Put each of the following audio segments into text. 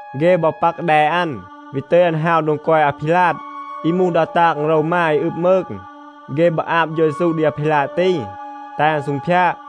เฆ บอ ปัก แด อัน, วี ตึย อัน ฮาว โดง กอย อาพีลาด อี มูห ดา ตาง โรวมา อี อึบ มืง. เฆ บอ อาบ เฌา เยซู ดี อาพีลาด ตี, แตห อัน ซูงพยาด.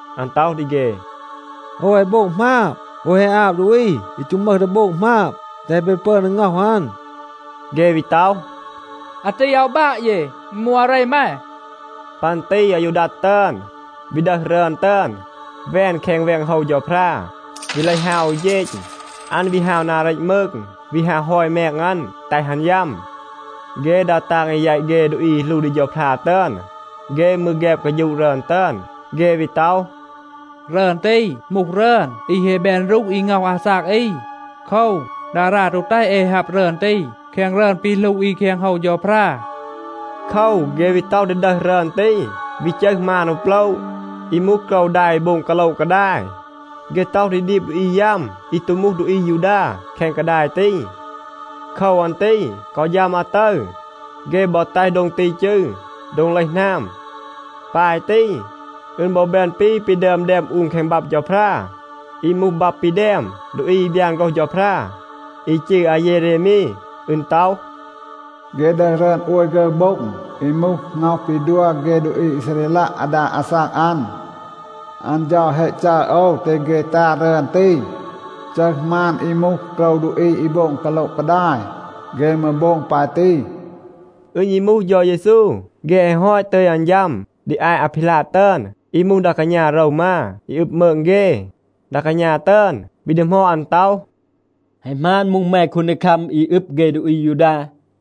อัน ต็อห ดี เฆ, “โอว แฮะ โบง หมาบ. โอว แฮะ อาบ ดูอี อี ตู มึห ดี โบง หมาบ, แตห เบ ปึอน ดี ง็อห อัน.” เฆ วี ต็อห, “อาตี อาว บาะ เย. อึณ มูห อาเร แม.” ปัน ตี อายูดัด ตึอน วี ดึห รึอน ตึอน, แวน แคง แวง โฮว เฌาพรา, วี เลห ฮาว อู เฌณ. อัน วี ฮาว นา เรต มืง, วี ฮาว ฮอย แมง อัน, แตห อัน ยัม. เฆ ดา ตาง อี แยต เฆ ดูอี อี หลู ดี เฌาพรา ตึอน, เฆ มืร แฆบ กาฌูะ รึอน ตึอน. เฆ วี ต็อห, “รึอน ตี มูห รึอน อี แฮะ แบน รูห อี ง็อห อาซาก อี. โคว, ดารา ตู แตห เอ ฮับ รึอน ตี แคง รึอน ปี หลู อี แคง โฮว เฌาพรา.” โคว, เฆ วี ต็อห ดี ดึห รึอน ตี, วี จึห มาน อู โปละ อี มูห โกรว ดา อี โบง กาโละ กาดาย. เฆ ต็อห ดี ดีบ ดูอี ยัม อี ตู มูห ดูอี อายูดา แคง กาดาย ตี. โคว อัน ตี กอ ฌัม อาตึร, เฆ บอ แตห โดง ตี จืร “โดง เลห หนาม.” ปาย ตี, อึณ บอ แบน ปี ปี ดึอม แดม อูน แคง บับ เฌาพรา. อี มูห บับ ปี แดม ดูอี อี บยาน โฆรห เฌาพรา, อี จืร อาเยเรมี. อึณ ต็อห, “เฆ ดึห รึอน โอย ฆึร โบ็ง อี มูห ง็อห ปี ดัว เฆ ดูอี อีซาเรลัะ อาดา อาซาก อัน. อัน เฌา แฮะ จัร โอว, แตห เฆ ตา รึอน ตี, จึห มาน อี มูห โกรว ดูอี อี โบง กาโละ กาดาย. เฆ มืร โบง ปาย ตี.” อึณ ยี มูห เฌา เยซู, เฆ แฮะ ฮอต ตึย อัน ฌัม ดี อาต อาพีลาด ตึอน อี มูห ดา กาณา โรวมา อี อึบ มืง เฆ. ดา กาณา ตึอน วี ดีหมอด อัน ต็อห, “แฮะ หมาน มูห แม คูนดีคัม อี อึบ เฆ ดูอี อายูดา?”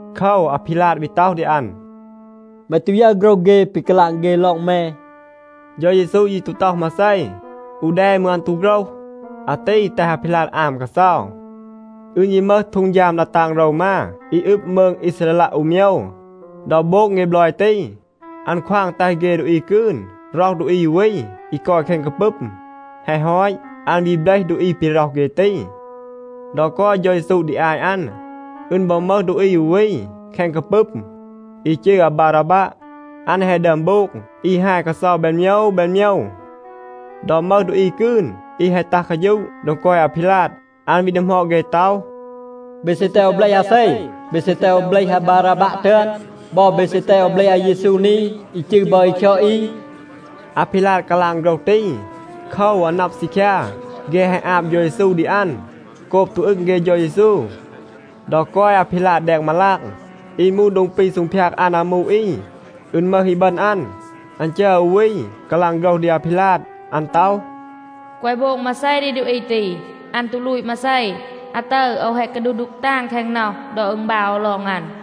โคว, อาพีลาด วี ต็อห ดี อัน, “แม ตู ยึร โฆรห เฆ, ปี กาลาง เฆ ลอง แม?” เฌา เยซู ยี ตู ต็อห มาเซ. อู แด มืร อัน ตู โฆรห. อาตี แตห อาพีลาด อาม กาเซา. อึณ ยี มึห ฮีด ดา ตาง โรวมา อี อึบ มืง อีซาเรลัะ อู โมยว. ดอ โบง เฆ บลอย ตี, อัน ควาง แตห เฆ ดูอี กืน ร็อห ดูอี อู วี อี กอย แคง กาปึม. แฮะ ฮอต, อัน วี เบลห ดูอี ปี ร็อห เฆ ตี. ดอ กอย เฌา เยซู ดี อาต อัน, อึณ บอ มึห ดูอี อู วี แคง กาปึม อี จืร อาบาราบัะ. อัน แฮะ ดึอม โบง อี ฮาย กาเซา แบน โมยว แบน โมยว. ดอ มึห ดูอี กืน อี แฮะ ตัห กาฌูะ โดง กอย อาพีลาด, อัน วี ดีหมอด เฆ ต็อห, “เบ ซี แตห โอว เบลห อาเซ? เบ ซี แตห โอว เบลห อาบาราบัะ ตึอน? บอ, เบ ซี แตห โอว เบลห อาเยซู นี, อี จืร บอ อี คยอด อี?” อาพีลาด กาลาง โฆรห ตี. โคว, อัน นับ ซีคยา, เฆ แฮะ อาบ เฌา เยซู ดี อัน โกบ ตู อึง เฆ เฌา เยซู. ดอ กอย อาพีลาด แดง มาลาง อี มูห โดง ปี ซูงพยาด อัน อามู อี, อึณ มึห อีบึณ อัน, อัน จัร อู วี กาลาง โฆรห ดี อาพีลาด. อัน ต็อห, “แกวะ โบง มาเซ ดี ดูอี ตี. อัน ตู ลูต มาเซ. อาตึร โอว แฮะ กาดูห ดูก ตาง แคง น็อห ดอ อึณบาว โอว ลอง อัน.”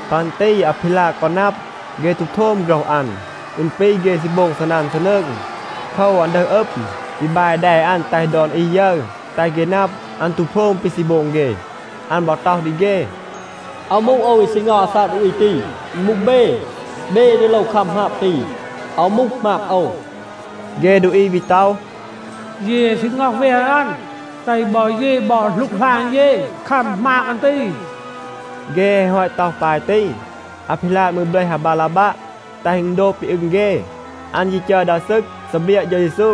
ปัน ตี อาพีลาด กอ นับ, เฆ ตู โทม โฆรห อัน. อึณ ปี เฆ ซี โบง ซีนัน ซีนืง. โคว, อัน ดึห อึม, วี บาย แด อัน แตห ดอน อี ยึร, แตห เฆ นับ, อัน ตู โพรม ปี ซี โบง เฆ. อัน บอ ต็อห ดี เฆ, “อาว มูห โอว, อี ซี ง็อห อาซาก ดูอี ตี. อึณ มูห เบ. เบ อี ดี โลว คัม หมาบ ตี. อาว มูห หมาบ โอว.” เฆ ดูอี วี ต็อห, “เย แฮะ ซี ง็อห แวน อัน. แตห บอ เย บอ หลูกหลาน เย คัม หมาบ อัน ตี.” เฆ แฮะ ฮอต ต็อห ปาย ตี, อาพีลาด มืร เบลห อาบาราบัะ, แตห อึณ โดบ ปี อึง เฆ. อัน ยี จัร ดา ซึก ซีเบรียะ เฌา เยซู.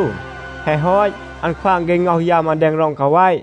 แฮะ ฮอต, อัน ควาง เฆ ง็อห ยัม อัน แดง ร็อง กาแวะ.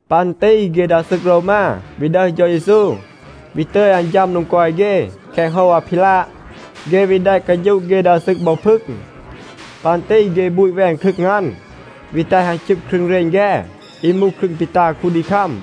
ปัน ตี เฆ ดา ซึก โรวมา วี ดึห เฌา เยซู, วี ตึย อัน ฌัม โดง กอย เฆ แคง โฮว อาพีลาด. เฆ วี แดะ กาฌูะ เฆ ดา ซึก บอ พึง. ปัน ตี เฆ บูต แวน ครึง อัน, วี แตห อัน ชึบ ครึง เรณ แฆ, อี มูห ครึง ปี ตา คูนดีคัม.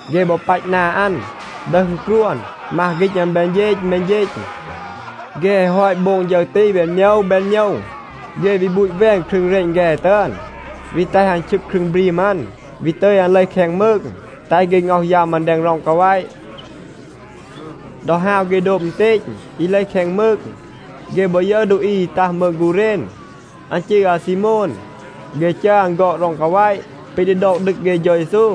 เฆ บอ ปัต นา อัน, ดึห อึณกรวน, มัห ฆีณ อัน แบน เฌณ แบน เฌณ. เฆ แฮะ ฮอต โบง ฌึร ตี แบน โมยว แบน โมยว, เฆ วี บูต แวน ครึง เรณ แฆ ตึอน, วี แตห อัน ชึบ ครึง บรีม อัน, วี ตึย อัน เลห แคง มืง, แตห เฆ ง็อห ยัม อัน แดง ร็อง กาแวะ. ดอ ฮาว เฆ โดบ อึณเตณ อี เลห แคง มืง, เฆ บอ ยึร ดูอี อี ตัห มืง กูเรณ. อัน จืร อาซีโมน. เฆ จัร อัน ฆอด ร็อง กาแวะ ปี ดี ดอก ดึก เฆ เฌา เยซู.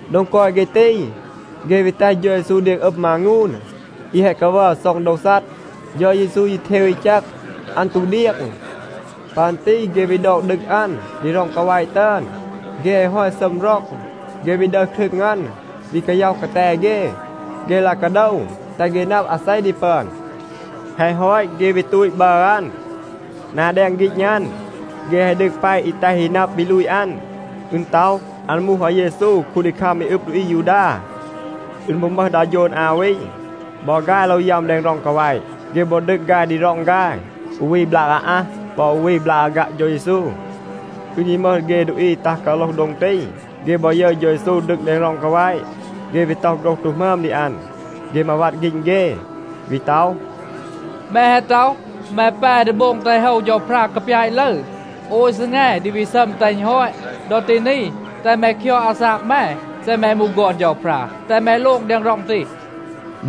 โดง กอย เฆ ตี, เฆ วี แตห เฌา เยซู เดียง อึม มางูน อี แฮะ กาวัร ซ็อง โดว ซัด. เฌา เยซู ยี เทว อี แจก. อัน ตู เดียง. ปัน ตี เฆ วี ดอก ดึก อัน ดี ร็อง กาแวะ ตึอน. เฆ แฮะ ฮอต ซัม ร็อง, เฆ วี ดึห ครึง อัน วี กาย็อห กาแต เฆ. เฆ ลาย กาโดว, แตห เฆ นับ อาเซ ดี ปึอน. แฮะ ฮอต, เฆ วี ตูต บัร อัน. นา แดง ฆีณ อัน, เฆ แฮะ ดึก แปะ อี แตห อี นับ ปี ลูต อัน. อึณ ต็อห, “อัน มูห อาเยซู, คูนดีคัม อี อึบ ดูอี อายูดา.” อึณ บอ มึห ดา โฌน อา วี. บอ ฆาย โลว ยัม แดง ร็อง กาแวะ. เฆ บอ ดึก ฆาย ดี ร็อง ฆาย, อู วี บลาก อาอัห, ปอ อู วี บลาก อาฆัะ เฌา เยซู. อึณ ยี มึห เฆ ดูอี อี ตัห กาโลห โดง ตี. เฆ บอ ยึร เฌา เยซู ดึก ดี ร็อง กาแวะ, เฆ วี ต็อห โฆรห ตู หมึอม ดี อัน. เฆ มาวัด ฆีณ เฆ, วี ต็อห, “แม แฮะ ต็อห, แม แป ดี โบง แตห โฮว เฌาพรา กาปยาต ลึร, โอย ซีแง ดี วี ซัม แตห อึณ ฮอต. ดอ ตี นี, แตห แม คยอด อาซาก แม. เซ แม มูห ฆอน เฌาพรา, แตห แม โลง แดง ร็อง ตี.”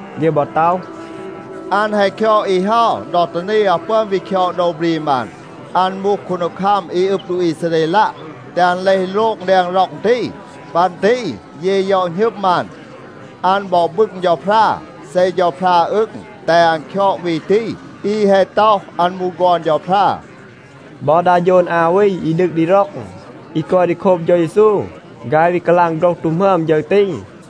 เฆ บอ ต็อห, “อัน แฮะ คยอด อี เฮา, ดอ ตี นี อาว ปึอน วี คยอด โดว บรีม อัน. อัน มูห คูนดีคัม อี อึบ ดูอี อีซาเรลัะ. แตห อัน เลห โลง แดง ร็อง ตี. ปัน ตี เย ยอะ หณึม อัน. อัน บอ บึง เฌาพรา. เซ เฌาพรา อึง, แตห อัน คยอด วี ตี, อี แฮะ ต็อห, อัน มูห ฆอน เฌาพรา.” บอ ดา โฌน อา วี อี ดึก ดี ร็อง อี กอย ดี โคบ เฌา เยซู, ฆาย วี กาลาง โฆรห ตู หมึอม ฌึร ตี.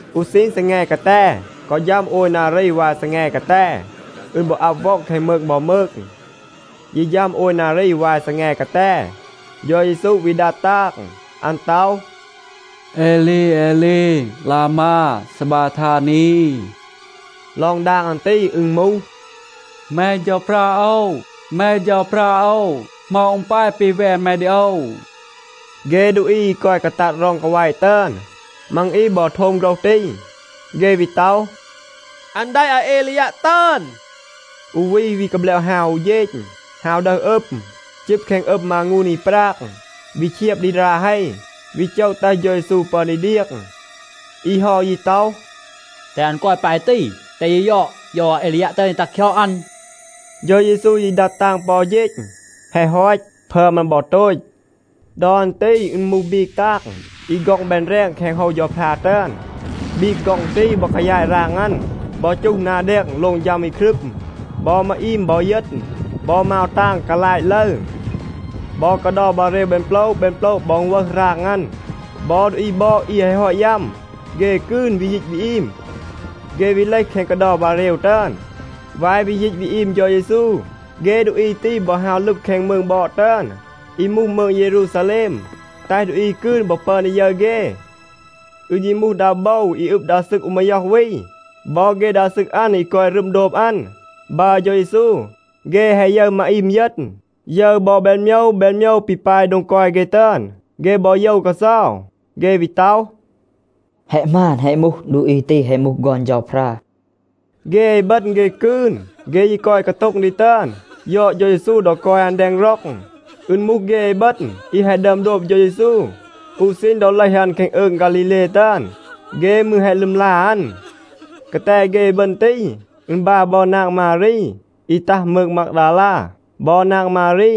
อู ซีณ ซีแง กาแต กอ ฌัม โอย นารี วาย ซีแง กาแต, อึณ บอ อับ ว็อง แคง มืง บอ มืง. ยี ฌัม โอย นารี วาย ซีแง กาแต, เฌา เยซู วี ดัด ตาง. อัน ต็อห, “เอลี เอลี ลามา ซาบาทานี.” ลอง ดาง อัน ตี, อึณ มูห, “แม เฌาพรา โอว, แม เฌาพรา โอว, เหมา อึณ ปาย ปี แวน แม ดี โอว.” เฆ ดูอี อี กอย กาตัด ร็อง กาแวะ ตึอน, มัง อี บอ โทม โฆรห ตี. เฆ วี ต็อห, “อัน แดะ อาเอลียัะ ตึอน.” อู วี วี กาแบลบ ฮาว อู เฌณ, ฮาว ดึห ดีห อึม, จึบ แคง อึม มางูน อี ปราง, วี เชียบ ดี รา เฮ, วี โจะ แตห เฌา เยซู ปึอน ดี เดียง. อี เฮา ยี ต็อห, “แตห อัน กอย ปาย ตี, แตห เย ยอด, โยว อาเอลียัะ ตึอน ดี ตัห คยอด อัน.” เฌา เยซู ยี ดัด ตาง ปอ อู เฌณ. แฮะ ฮอต, พึอม อัน บอ โตต. ดอ อัน ตี อึณ มูห บีก ตาง อี ฆ็อง แบน แรง แคง โฮว เฌาพรา ตึอน. บีก ฆ็อง ตี บอ กายาต ราง อัน, บอ จูห นา แดง, โลง ฌัม อี ครึม. บอ มาอีม บอ เยณ, บอ มาว ตาง กาลาต ลึร. บอ กาเดา บาเรว แบน โปละ แบน โปละ บอ อึณ วึห ราง อัน. บอ ดูอี บอด อี แฮะ ฮอต ยัม, เฆ กืน วี ยีต วี อีม. เฆ วี เลห แคง กาเดา บาเรว ตึอน. วาย วี ยีต วี อีม เฌา เยซู, เฆ ดูอี ตี บอ ฮาว ลึบ แคง มืง บอด ตึอน, (อี มูห มืง เยรูซาแลม), แตห ดูอี กืน บอ ปึอน ดี ยึร เฆ. อึณ ยี มูห ดา โบว อี อึบ ดา ซึก อู มาย็อห วี บอ เฆ ดา ซึก อัน อี กอย รึม โดบ อัน, บัร เฌา เยซู. เฆ แฮะ ยึร มาอีม เยณ, ยึร บอ แบน โมยว แบน โมยว ปี ปาย โดง กอย เฆ ตึอน, เฆ บอ โยว กาเซา. เฆ วี ต็อห, “แฮะ หมาน, แฮะ มูห, ดูอี ตี แฮะ มูห ฆอน เฌาพรา.” เฆ อีบึณ, เฆ กืน, เฆ ยี กอย โต็ง ดี ตึอน, ยอด เฌา เยซู ดอ กอย อัน แดง ร็อง. อึณ มูห เฆ อีบึณ อี แฮะ ดึอม โดบ เฌา เยซู อู ซีณ ดอ เลห อัน แคง อืง ฆาลีเล ตึอน. เฆ มืร แฮะ ลึมลา อัน. กาแต เฆ อีบึณ ตี, อึณ บาะ บอ นาง มารี อี ตัห มืง มากดาลา บอ นาง มารี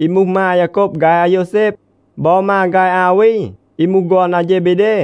อี มูห มา อายาโกบ ฆาย อาโยวแซบ บอ มา ฆาย อา วี อี มูห ฆอน อาเฌเบเด.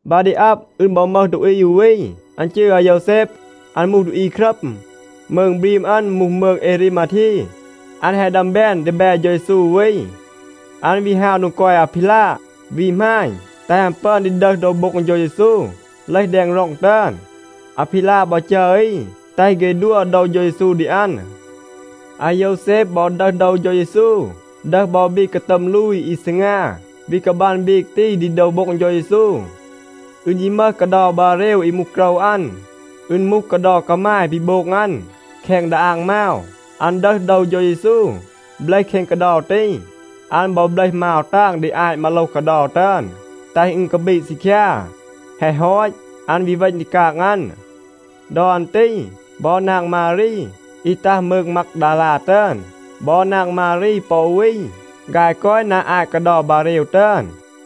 บา ดี อับ, อึณ บอ มึห ดูอี อู วี, อัน จืร อาโยวแซบ. อัน มูห ดูอี ครัม. มืง บรีม อัน มูห มืง เอรีมาที. อัน แฮะ ดึอม แบน ดีแบ เฌา เยซู อู วี. อัน วี ฮาว โดง กอย อาพีลาด, วี หมาณ, แตห อัน ปึอน ดี ดึห โดว โบ็ง เฌา เยซู เลห แดง ร็อง ตึอน. อาพีลาด บอ จัร อี, แตห เฆ ดัว โดว เฌา เยซู ดี อัน. อาโยวแซบ บอ ดึห โดว เฌา เยซู, ดึห บอ บีก กาตัม ลูย อี ซีงา, วี กาบัน บีก ตี ดี โดว โบ็ง เฌา เยซู. อึณ ยี มึห กาเดา บาเรว อี มูห โกรว อัน. อึณ มูห กาเดา กามาย ปี โบง อัน แคง ดาอาง มาว. อัน ดึห โดว เฌา เยซู เบลห แคง กาเดา ตี. อัน บอ เบลห มาว ตาง ดี อาต มาโลห กาเดา ตึอน, แตห อึณ กาบีด ซีคยา. แฮะ ฮอต, อัน วี เวณ ดี กาง อัน. ดอ อัน ตี บอ นาง มารี อี ตัห มืง มากดาลา ตึอน บอ นาง มารี ปอ อู วี, ฆาย กอย นา อาต กาเดา บาเรว ตึอน.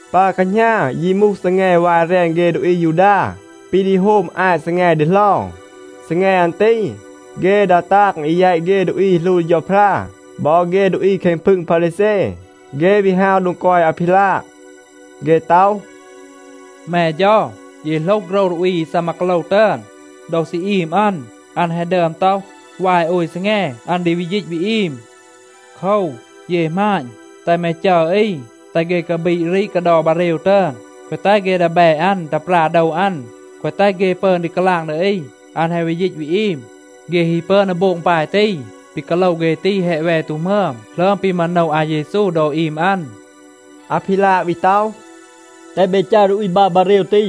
ปา แคหณา ยี มูห ซีแง วาย แรน เฆ ดูอี อายูดา ปี ดี โฮม อาต ซีแง ดีเหลา. ซีแง อัน ตี, เฆ ดา ตาง อี แยต เฆ ดูอี อี หลู ดี เฌาพรา บอ เฆ ดูอี แคง พึง พารีแซ, เฆ วี ฮาว โดง กอย อาพีลาด. เฆ ต็อห, “แม เฌา, เย โหลห โฆรห ดูอี อี ซีมา กาโลว ตึอน. ดอ ซี อีม อัน, อัน แฮะ ดึอม ต็อห, วาย โอย ซีแง อัน ดี วี ยีต วี อีม. โคว, เย หมาณ, แตห แม จัร อี, แตห เฆ กาบีด รีด กาเดา บาเรว ตึอน, แกวะ แตห เฆ ดีแบ อัน ตัห ปรา โดว อัน, แกวะ แตห เฆ ปึอน ดี กาลาง ดี อี, อัน แฮะ วี ยีต วี อีม. เฆ ฮี ปึอน ดี โบง ปาย ตี, ปี กาโลว เฆ ตี แฮะ แว ตู หมึอม หลึอม ปี มาโนว อาเยซู ดอ อีม อัน.” อาพีลาด วี ต็อห, “แตห เบ จัร ดูอี บัร บาเรว ตี.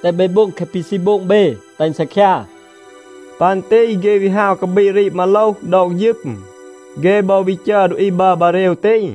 แตห เบ โบง แคะ ปี ซี โบง เบ, แตห อึณ ซีคยา.” ปัน ตี เฆ วี ฮาว กาบีด รีด มาโลห, ดอก ฌึม. เฆ บอ วี จัร ดูอี บัร บาเรว ตี.